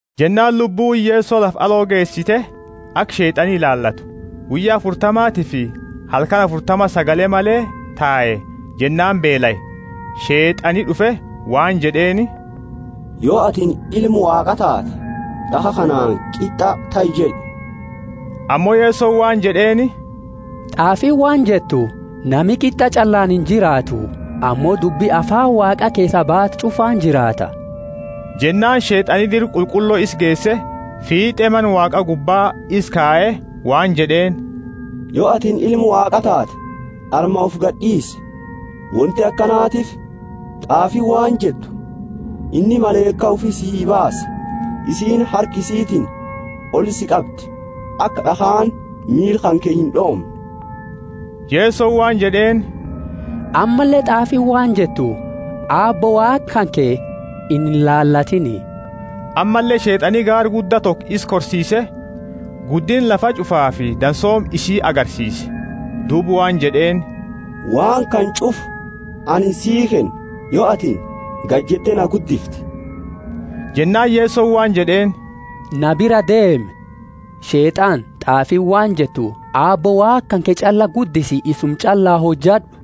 Jennaani Lubbuuni Yeso lafa aloo geesite, aka Sheet'ani ilaalatu. Guyya afurtamatifi halkani afurtama sagale male tae, jennaani beelae. Sheet'ani d'ufe waan jed'eeni, Yo atini Ilma Waaqa taate, d'akha kanaani, Qit'a tahi jed'i. Ammo Yesoni waan jed'eeni, T'aafiini waan jettu, Nami qit'a ch'allaani injiraatu, ammo dubbi afaani Waaqa keesaa baate ch'ufaani jiraata. Jennaani Sheet'ani Dira Qulqullo isa geese, fiit'e Mana Waaqa gubba isa kaye, waan jed'eeni, Yo atini Ilma Waaqa taate, arma ufi gadi d'iisi, wonti akanatiifi t'aafiini waan jettu, Inni malaika ufi sii baasa, isiini harka isitiini oli si qabdi, aka d'akhaani miila kanke ind'oomne. Yesoni waan jed'eeni, Ammalle t'aafiini waan jettu, Aabbo Waaqa kanke inilaalatiini. Ammalle Sheet'ani gaara gudda toko isa korsiise, guddinna lafa ch'ufaafi dansooma isii agarsiise. Duuba waan jed'eeni, Waan kana ch'ufa anini sii kenna, yo atini gadi jette na guddifte. Jennaani Yesoni waan jed'eeni, na biraa deemi, Sheet'ana t'aafiini waan jettu Aabbo Waaqa kanke ch'alla guddisi isuma ch'alla hojad'u!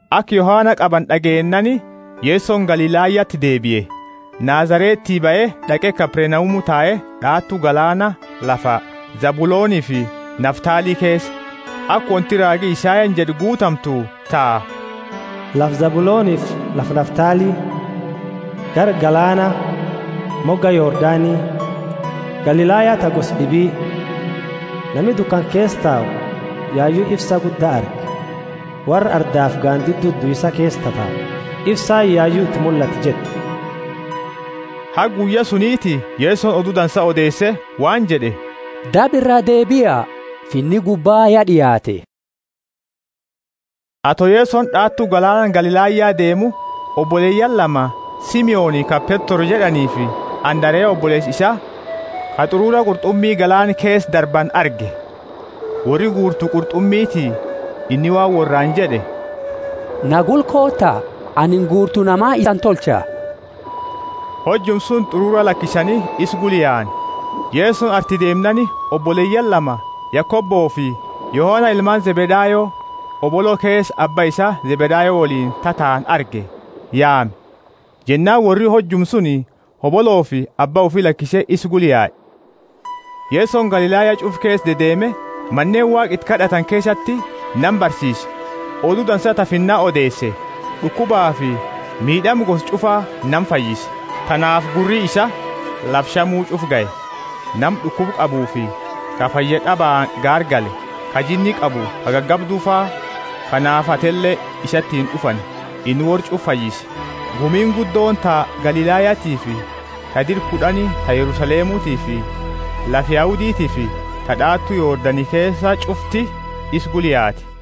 Aka Yohana qabani d'ageennaani Yesoni Galilayati deebie. Nazareti bahe d'aqe Kapernaumu tae, d'aatu galaana, lafa Zabulonifi Naftali keesa, aka wonti raagi Isayani jed'e guutamtu ta, Lafa Zabulonifi lafa Naftali, gara galaana, moga Yordani, Galilaya ta gosa d'ibi! Nami dukana keesa tau yayu ifsa gudda arge worra ardaafi gandidu duisa keesa tatau ifsaani yayu iti mullate jettu. Haga guyya suniti Yesoni odu dansa odeese waan jed'e, Daba iraa deebia, Finni gubba ya d'iaate. Ato Yesoni d'aatu galaana Galilaya deemu, oboleyaani lama, Simoni ka Petro jed'aniifi Andarea oboleesa isaa, ka t'urura qurt'umi galaana keesa darbani arge; worri guurtu qurt'umiiti. Inni waan worraani jed'e, Na gula koota, anini guurtu nama isani tolcha. Hojuma suni t'urura lakisani isa gula yaani. Yesoni arti deemnaani oboleyaani lama, Yakobofi Yohana ilmaani Zebedayo, hobolo keesa abba isaani Zebedayo woliini tataani arge, yaame; jennaani worri hojuma suni hoboloofi abba ufi lakise isa gula yae. Yesoni Galilaya ch'ufa keesa dedeeme Maneeni Waaqa iti kad'atani keesati nama barsiise, Odu Dansa ta Finna odeese, d'ukubafi miid'ama gosa ch'ufa nama fayyise. Tanaafi gurri isaa lafa Shamu ch'ufa gahe, nama d'ukuba qabuufi ka fayyad'abaani gaargale, ka jinni qabu, ka gagabdufa, ka naafatele isatiini d'ufani, inni worra ch'ufa fayyise. Gumiini guddooni ta Galilayatiifi ta dira kud'ani, ta Yerusalemutiifi lafa Yahuditiifi ta d'aatu Yordani keesa ch'ufti isa gula yaate.